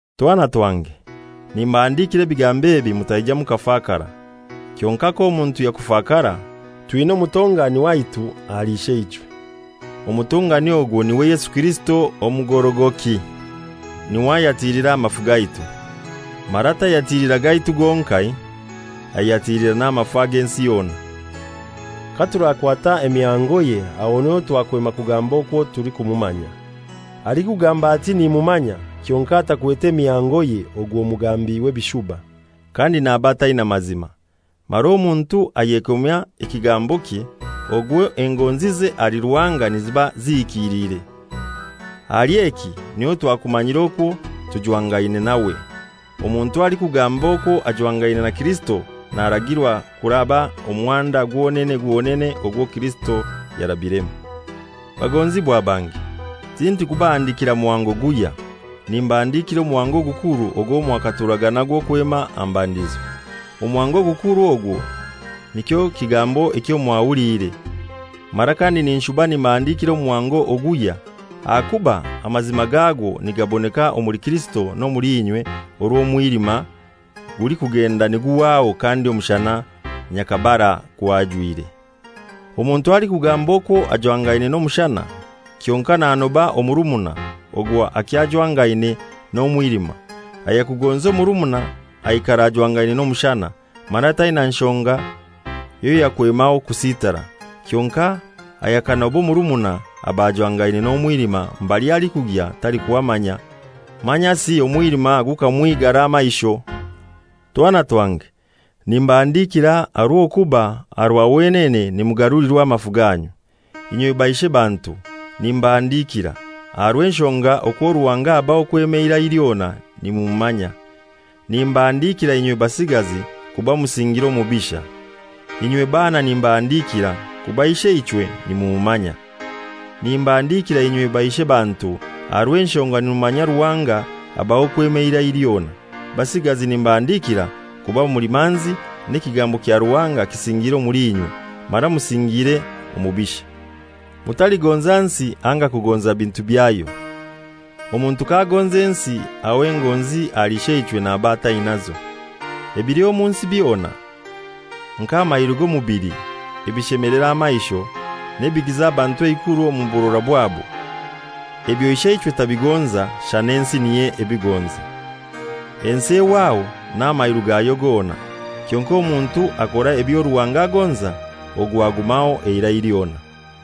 Twana twange, nimbahandikira ebigambo ebi mutaija mukafakara. Kyonkai k'omuntu yakufakara, twina omutongani waitu ahali Isheichwe, omutongani ogwo niwe Yesu Kirisito omugorogoki. Niwe ayatilira amafu gaitu, mara tayatilira gaitu gonkai, ayatilira n'amafu ag'ensi yona. Katurakwata emihangoye aho niho twakwema kugamba okwo tulikumumanya. Alikugamba ati, ┬źNimumanya,┬╗ kyonkai atakwete mihangoye ogwo mugambi w'ebishuba, kandi naba ataina mazima. Mara omuntu ayekomya ekigambokye, ogwo engonzize ahali Ruhanga niziba zihikiliire. Ahali eki niho twakumanyira okwo tujwangaine nawe. Omuntu alikugamba okwo ajwangaine na Kirisito naragirwa kuraba omuhanda gwonene gwonene ogwo Kirisito yarabiremu. Bagonzibwa bange, tindikubahandikira muhango guhya. Nimbahandikira omuhango ogukuru ogwo mwakaturaga nagwo kwema aha mbandizo. Omuhango ogukuru ogwo nikyo kigambo ekyo mwahuliire. Mara kandi ninshuba nimbahandikira omuhango oguhya, ahakuba amazima gagwo nigaboneka omuli Kirisito n'omuli inywe, orw'omwilima gulikugenda niguhwaho kandi omushana nyakabara gwajwire. Omuntu alikugamba okwo ajwangaine n'omushana kyonkai okwo nanoba omurumuna, ogwo akyajwangaine n'omwilima. Ayakagonza omurumuna aikara ajwangaine n'omushana, mara taina nshonga yoyakwemaho kusitara. Kyonkai ayakanoba omurumuna aba ajwangaine n'omwilima mbali alikugya talikuhamanya, manyasi omwilima gukamwigara amaisho. Twana twange, nimbahandikira aha rw'okuba aha rwa wenene nimugarulirwa amafu ganyu. Inywe baishebantu nimbahandikira, aha rw'enshonga okwo Ruhanga abaho kwema eirai lyona nimumanya. Nimbahandikira inywe basigazi, kuba musingire omubisha. Inywe baana nimbahandikira, kuba Isheichwe nimumumanya. Nimbahandikira inywe baishebantu aha rw'enshonga nimumanya Ruhanga abaho kwema eira lyona. Basigazi nimbahandikira kuba muli manzi, n'ekigambo kya Ruhanga kisingiire omuli inywe, mara musingire omubisha. Mutaligonza nsi anga kugonza bintu byayo. Omuntu k'agonza ensi aho engonzi ahali Isheichwe naba atainazo. Ebili omu nsi byona, nk'amairu g'omubili, ebishemelera amaisho, n'ebigiza abantu eikuru omu burora bwabo, ebyo Isheichwe tabigonza, shana ensi niyo ebigonza. Ensi ehwaho, n'amairu gayo gona. Kyonkai omuntu akora ebyo Ruhanga agonza, ogwo agumaho eirai lyona.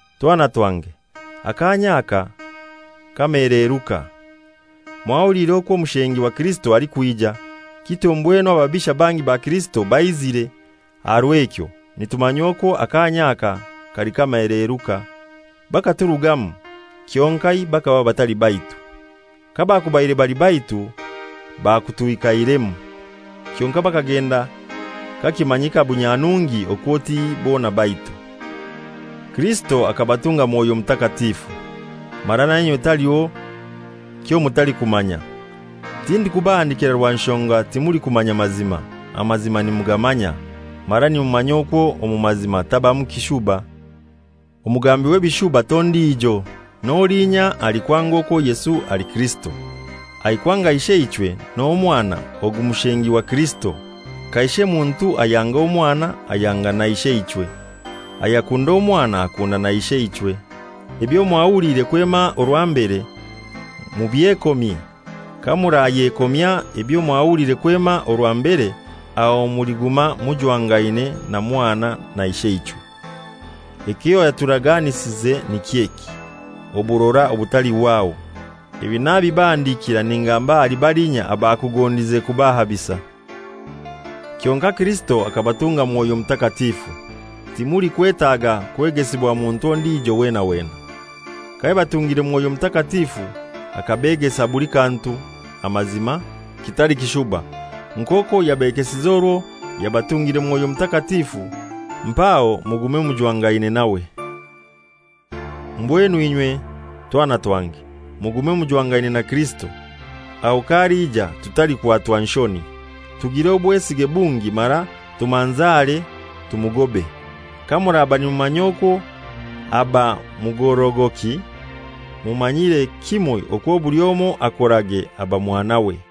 Twana twange, akaanya aka k'amaheleeruka. Mwahuliire okwo omushengi wa Kirisito alikwija, kityo mbwenu ababisha bangi ba Kirisito baizire. Aha rw'ekyo nitumanya okwo akaanya aka kali k'amaheleeruka. Bakaturugamu, kyonkai bakaba batali baitu. Kabakubaire bali baitu bakutwikairemu. Kyonkai bakagenda kakimanyika bunyanungi okwo ti bona baitu. Kirisito akabatunga Mwoyo Mutakatifu, mara nainywe taliho kyomutalikumanya. Tindikubahandikira rwa nshonga timulikumanya mazima, amazima nimugamanya, mara nimumanya okwo omu mazima tabamu kishuba. Omugambi w'ebishuba t'ondijo, n'olinya alikwanga okwo Yesu ali Kirisito. Alikwanga Isheichwe n'Omwana, ogu mushengi wa Kirisito. Kaishe muntu ayanga Omwana ayanga na Isheichwe. Ayakunda Omwana akunda na Isheichwe. Ebyo mwahuliire kwema orwa mbere mubyekomye. Kamurayekomya ebyo mwahuliire kwema orwa mbere, aho muliguma mujwangaine na Mwana na Isheichwe. Ekyo yaturaganisize niky'eki: Oburora obutalihwaho. Ebi nabibahandikira ningamba ahali balinya abakugondize kubahabisa. Kyonkai Kirisito akabatunga Mwoyo Mutakatifu, timulikwetaga kwegesibwa muntu ondijo wena wena. Kayabatungire Mwoyo Mutakatifu akabegesa buli kantu, amazima, kitali kishuba. Nk'okwo yabegesize orwo yabatungire Mwoyo Mutakatifu, mpaho mugume mujwangaine nawe. Mbwenu inywe twana twange, mugume mujwangane na Kirisito, aho k'aliija tutalikwatwa nshoni, tugire obwesige bungi mara tumanzare tumugobe. Kamuraba nimumanya okwo aba mugorogoki, mumanyire kimoi okwo buli omoi akorage aba mwanawe.